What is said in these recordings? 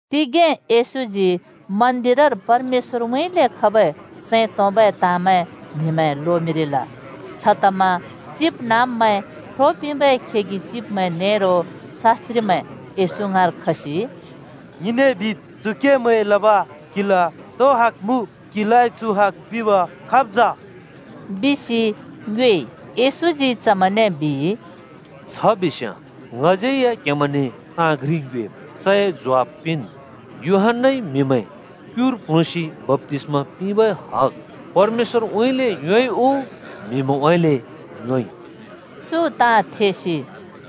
तिगें येशूजी मन्दिरर परमेश्‍वरउँइँले खबै सैं तोंबै ताँमैं म्हिमैं लोमिंरिल। छतमा चिबनाँब्मैं, ख्रो पिंबै खेगि चिब्मैं नेरो शास्‍त्रिमैं येशू ङाँर खसि “ङिंने बिद्, चु केमैं लब क्हिला तो हक मुँ, क्‍हिलाइ चु हग पिंब खाब् जा?” बिसि ङ्योएइ। येशूजी चमैंने बिइ, “छ बिस्याँ ङज्यै या क्हेमैंने ताँ घ्रि ङ्योएम् चए ज्वाफ पिंन्। यूहन्‍नाइ म्हिमैं क्‍युर प्ल्‍हुँसि बप्‍तिस्मा पिंबै हग परमेश्‍वरउँइँले योंइ उ म्‍हिमैंउँइँले योंइ?” चु ताँ थेसि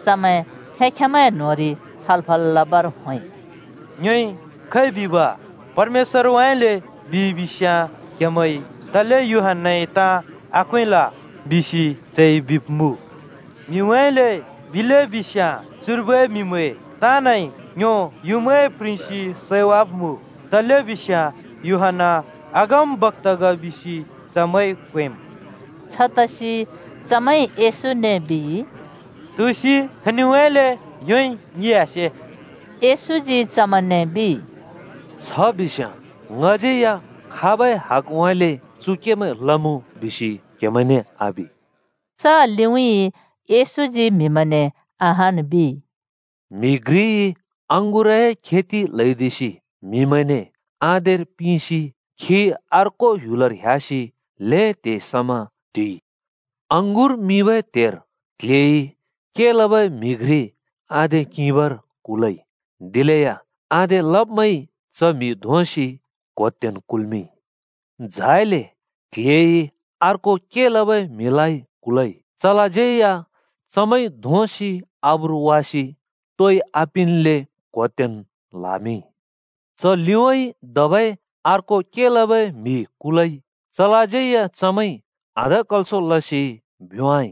चमैं खें-खेंमैंए न्होंरि छलफल लबर होंइ, “ङ्योइ खै बिब? ‘परमेश्‍वरउँइँले’ बिइ बिस्‍याँ क्‍हेमैंइ ‘तले यूहन्‍नाए ताँ आक्‍वेंल?’ बिसि चइ बिब्‍मुँ। ‘म्हिउँइँले’ बिले बिस्‍याँ चुर्बै म्‍हिमैं ताँनइ ङ्यो युँमाइ प्रिंसि सैवाब्‍मुँ, तलेबिस्याँ यूहन्‍ना अगमबक्‍ता ग बिसि चमैंइ क्वेंम्।” छतसि चमैंइ येशूने बिइ, “तुसि, खनिउँइँले योंइ? ङिइ आसे।” येशूजी चमैंने बिइ, “छ बिस्‍याँ ङज्यै या खाबै हकउँइँले चु केमैं लमुँ बिसि क्हेमैंने आबि।” च लिउँइँ येशूजी म्हिमैंने अहान् बिइ, “म्‍हि घ्रिइ अँगुरए खेति ल्हैदिसि म्हिमैंने आधेर पिसि खी अर्को ह्‍युलर ह्‍यासि ल्हें त्हे समा टिइ। अँगुर मिंबै त्‍हेर क्‍ल्‍हेइ के लबै म्हि घ्रि आधे किंबर कुलइ। दिलेया आधे लब्‍मैंइ च म्हि धोंसि क्होतेन् कुल्मिंइ। झाइले क्‍ल्‍हेइ अर्को के लबै म्हिलाइ कुलइ। चलाज्यै या चमैंइ धोंसि आब्रु वासि तोइ आपिंन्ले क्होतेन् ल्‍हामिंइ। च लिउँइँ धबै अर्को के लबै म्हि कुलइ। चलाज्यै या चमैंइ आधकल्सो लसि भ्‍योंवाइ।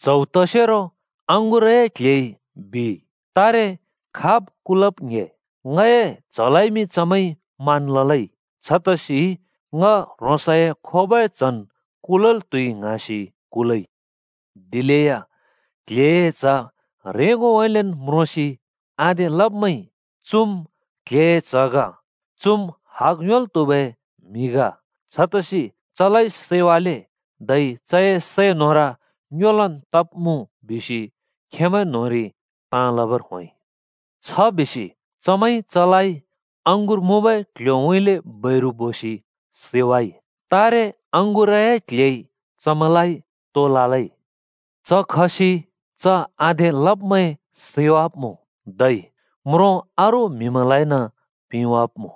“च्‍हौ तसेरो अँगुरए क्‍ल्‍हेइ बिइ, ‘तारे खाब् कुलब् ङ्‍हे? ङए च्हलाइमि चमैंइ मान ललै, छतसि ङ ह्रोंसए खोबै च्हन् कुलल् त्हुइ ङ्हाँसि कुलइ।’ दिलेया क्‍ल्‍हेए च्‍ह ह्रेंगोउँइँलेन् म्रोंसि आधे लब्‍मैंइ ‘चुम् क्‍ल्‍हेए च्‍ह ग। चुम् हक योंल् त्हुबै म्हि ग। छतसि चलाइ सैवाले धै चए सै न्होर ङ्योलन् तब्‍मुँ बिसि खेंमैं न्‍होंरि ताँ लबर होंइ।’ छ बिसि चमैंइ चलाइ अँगुर मुँबै क्ल्ह्‍योउँइँले बैरु बोसि सैवाइ। “तारे अँगुरए क्‍ल्‍हेइ चमैंलाइ तो ललै? च खसि च आधे लब्‍मैं सैवाब्मुँ, धै म्रों अरू म्हिमैंलाइन पिंवाब्मुँ।”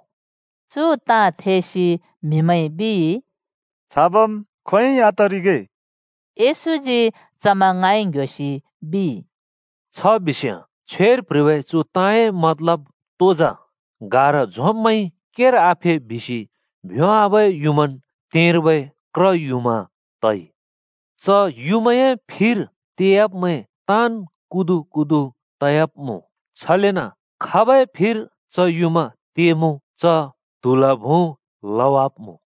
चु ताँ थेसि म्हिमैंइ बिइ, “छाबम् खोंयोंइ आतरिगे!” येशूजी चमैं ङाँइ ङ्‍ह्‍योसि बिइ, “छ बिस्‍याँ छ्वेर प्‍ह्रिबै चु ताँए मतलब तो जा? ‘गारा झोंब्‍मैंइ केर आफे बिसि भ्योंवाबै युँमान् तेंर्बै क्र युँमा तइ?’ च युँमाए फिर तेयाब्‍मैं ताँन् कुदुकुदु तयाब्मुँ, छलेन खाबै फिर च युँमा तेमुँ च त्‍हूलफुँ लवाब्‍मुँ।”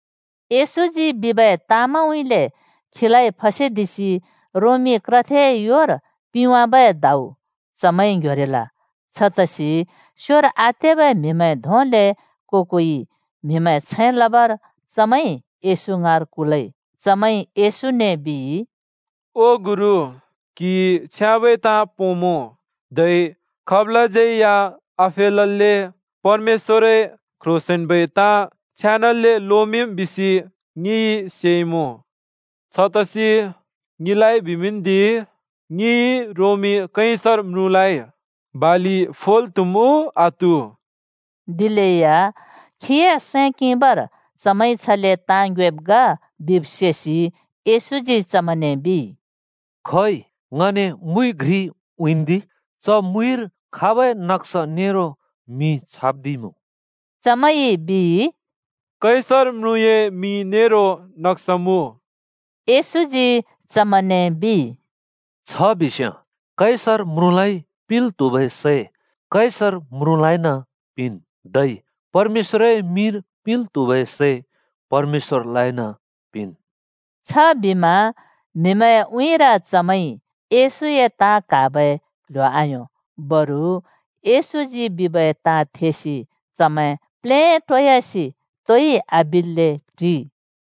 येशूजी बिबै ताँमैंउँइँले खीलाइ फसेदिसि रोमी क्रथेए योर पिंवाबै दाउ चमैंइ ङ्‍ह्‍योरिल। छतसि छ्याँबै के लब्मैं धों ब्योंबै म्‍हिमैं छैं लबर चमैंइ येशू ङाँर कुलइ। चमैंइ येशूने बिइ, “ओ गुरु, क्‍हिइ छ्याँबै ताँ पोंमुँ धै खाबलाज्यै या आफेलल्‍ले परमेश्‍वरए क्‍ह्रोंसेंन्‍बै ताँ छेनाले लोमिंम् बिसि ङिइ सेइमुँ। छतसि ङिलाइ बिमिंन्दि। ङिंइ रोमी कैसर म्रुँलाइ बालि फोल् त्हुम् उ आत्हु?” दिलेया खीए सैं किंबर चमैंइ छले ताँ ङ्योएब् ग बिब् सेसि येशूजी चमैंने बिइ, “खोइ ङने मुइ घ्रि उँइँन्दि। च मुइर खाबै नक्‍सा नेरो मिं छाप्‍दिइमुँ?” चमैंइ बिइ, “कैसर म्रुँए मिं नेरो नक्सा मुँ।” येशूजी चमैंने बिइ, “छ बिस्याँ कैसर म्रुँलाइ पिंल् त्हुबै सै कैसर म्रुँलाइन पिंन्। धै परमेश्‍वरए मिंर पिंल् त्हुबै सै परमेश्‍वरलाइन पिंन्।” छबिमा म्‍हिमैंए उँइँर चमैंइ येशूए ताँ क्हाबै क्ल्ह्‍यो आयों। बरु येशूजी बिबै ताँ थेसि चमैं प्लेटोयासि तोइ आबिल्‍ले टिइ।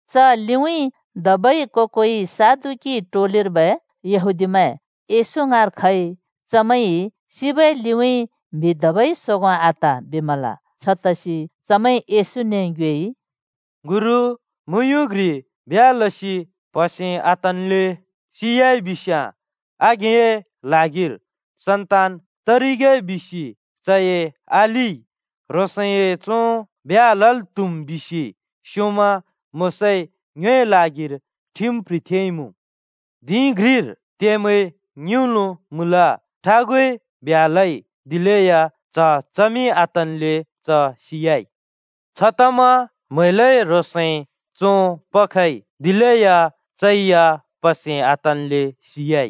च लिउँइँ धबै को-कोइ सदुकी टोलिर्बै यहूदीमैं येशू ङाँर खइ। चमैंइ “सिबै लिउँइँ म्‍हि धबै सोगों आत,” बिमल। छतसि चमैंइ येशूने ङ्योएइ, “गुरु, मुँयुँ घ्रि ब्ह्‍या लसि प्‍हसे आतन्‍ले सि‍याइ बिस्याँ, आघेंए ल्हागिर सन्तान तरिगे बिसि चए अलिइ ह्रोंसए चों ब्ह्‍या लल् त्‍हुम् बिसि स्‍योंमा मोशाइ ङ्योए ल्हागिर ठिम प्‍ह्रिथेइमुँ। धिं घ्रिर त्येमैं ङिउँलो मुँल। ठागुइ ब्ह्‍या लइ। दिलेया च्‍ह-चमि आतल्‍ले च सियाइ। छतमा म्हैलइ ह्रोंसए चों पखइ। दिलेया चै या प्‍हसे आतल्‍ले सियाइ।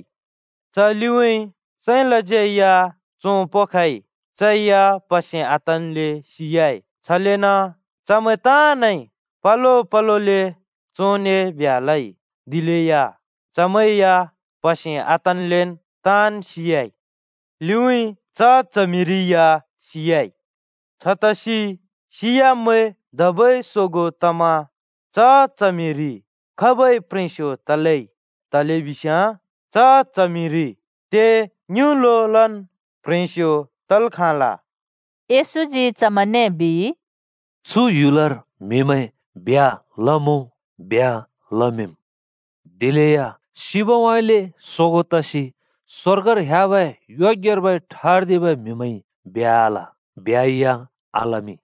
च लिउँइँ साँइँलाज्‍यै या चों पखइ। चै या प्‍हसे आतन्‍ले सियाइ। छलेन चमैं ताँनइ पलो पलोले चोंने ब्ह्‍या लइ, दिलेया चमैं या प्‍हसे आतल्‍लेन् ताँन् सियाइ। लिउँइँ च च्हमिरि या सियाइ। छतसि सियाब्‍मैं धबै सोगों तमा च च्हमिरि खाबै प्‍ह्रेंस्‍यो तलै? तलेबिस्याँ च च्हमिरि त्ये ङिंउँलोलन् प्ह्रेंस्यो तल् खाँल।” येशूजी चमैंने बिइ, “चु ह्‍युलर म्हिमैं ब्ह्‍या लमुँ, ब्ह्‍या लमिंमुँ। दिलेया सिबउँइँले सोगों तसि स्वर्गर ह्‍याबै योग्यर्बै ठर्दिबै म्हिमैंइ ब्ह्‍या आल, ब्ह्‍या आलमिं।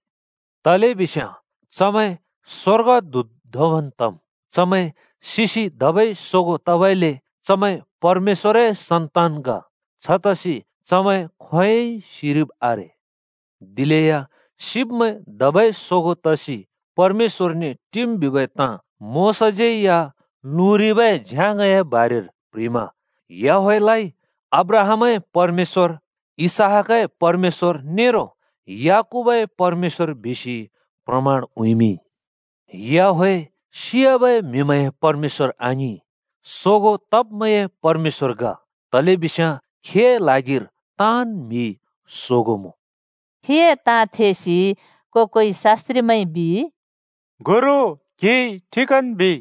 तलेबिस्याँ चमैं स्‍वर्गदूत धोंबन् तम्। चमैं सिसि धबै सोगों तबइले चमैं परमेश्‍वरए सन्तान ग। छतसि चमैं खोंयोंइ सिरिब् आरे। “दिलेया सिब्‍मैं धबै सोगों तसि परमेश्‍वरने टिम् बिबै ताँ मोशाज्‍यै या लुँरिबै झ्याङए बारेर प्‍ह्रिमा याहवेहलाइ ‘अब्राहामए परमेश्‍वर, इसहाकए परमेश्‍वर नेरो याकूबए परमेश्‍वर’ बिसि प्रमाण उँइँमिंइ। याहवेह सियाबै म्‍हिमैंए परमेश्‍वर आङिं, सोगों तब्मैंए परमेश्‍वर ग, तलेबिस्याँ खीए ल्हागिर ताँन् म्हि सोगों मुँ।” खीए ताँ थेसि को-कोइ शास्‍त्रिमैंइ बिइ, “ओ गुरु, क्‍हिइ ठिकन् बिइ।”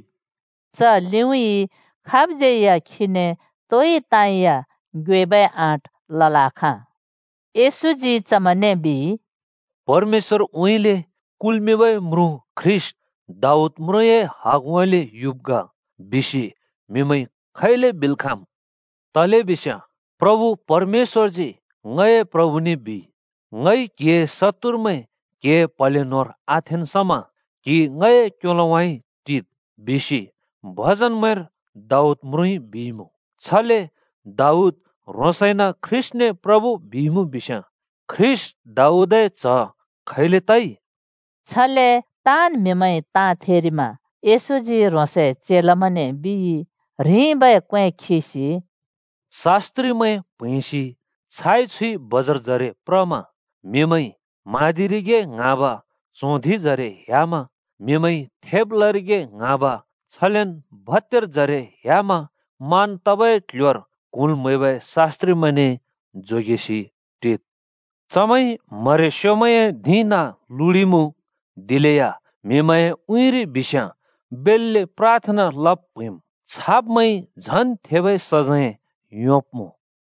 च लिउँइँ खाबज्यै या खीने तोइ ताँ या ङ्योएबै आँट लल् आखाँ। येशूजी चमैंने बिइ, “‘परमेश्‍वरउँइँले कुल्‍मिंबै म्रुँ ख्रीष्‍ट, दाऊद म्रुँए हाँगउँइँले युब् ग’ बिसि म्हिमैंइ खैले बिल् खाँम्? तलेबिस्याँ ‘प्रभु परमेश्‍वरजी ङए प्रभुने बिइ, “ङइ क्‍हिए शत्तुरमैं क्‍हिए प्‍हले न्‍होंर आथेंन् समा क्‍हि ङए क्‍योलोउँइँ टिद्,”’ बिसि भजनमैंर दाऊद म्रुँइ बिइमुँ। छले दाऊद ह्रोंसइन ख्रीष्‍टने प्रभु बिइमुँ बिस्याँ ख्रीष्‍ट दाऊदए च्ह खैले तइ?” छले ताँन् म्हिमैंइ ताँ थेरिमा येशूजी ह्रोंसए चेलामैंने बिइ, ह्रिंबै क्वे खिसि “शास्‍त्रिमैं प्हैंसि छाइ-छुइ बजारजरे प्रमा म्हिमैंइ म्हाँदिरिगे ङ्हाँब, च्हों धिंजरे ह्‍यामा म्हिमैंइ थेब लरिगे ङ्हाँब छलेन भत्‍यारजरे ह्‍यामा मान तबै क्‍ल्‍ह्‍योर क्हुँल् म्‍हैबै शास्त्रिमैंने जोगेसि टिद्। चमैंइ म्हरेस्‍योमैंए धिं नाँ लुडिमुँ। दिलेया म्‍हिमैंए उँइँरि बिस्याँ बेल्‍ले प्राथना लब् प्हैंम्। छाब्‍मैंइ झन् थेबै सजैं योंब्‍मुँ।”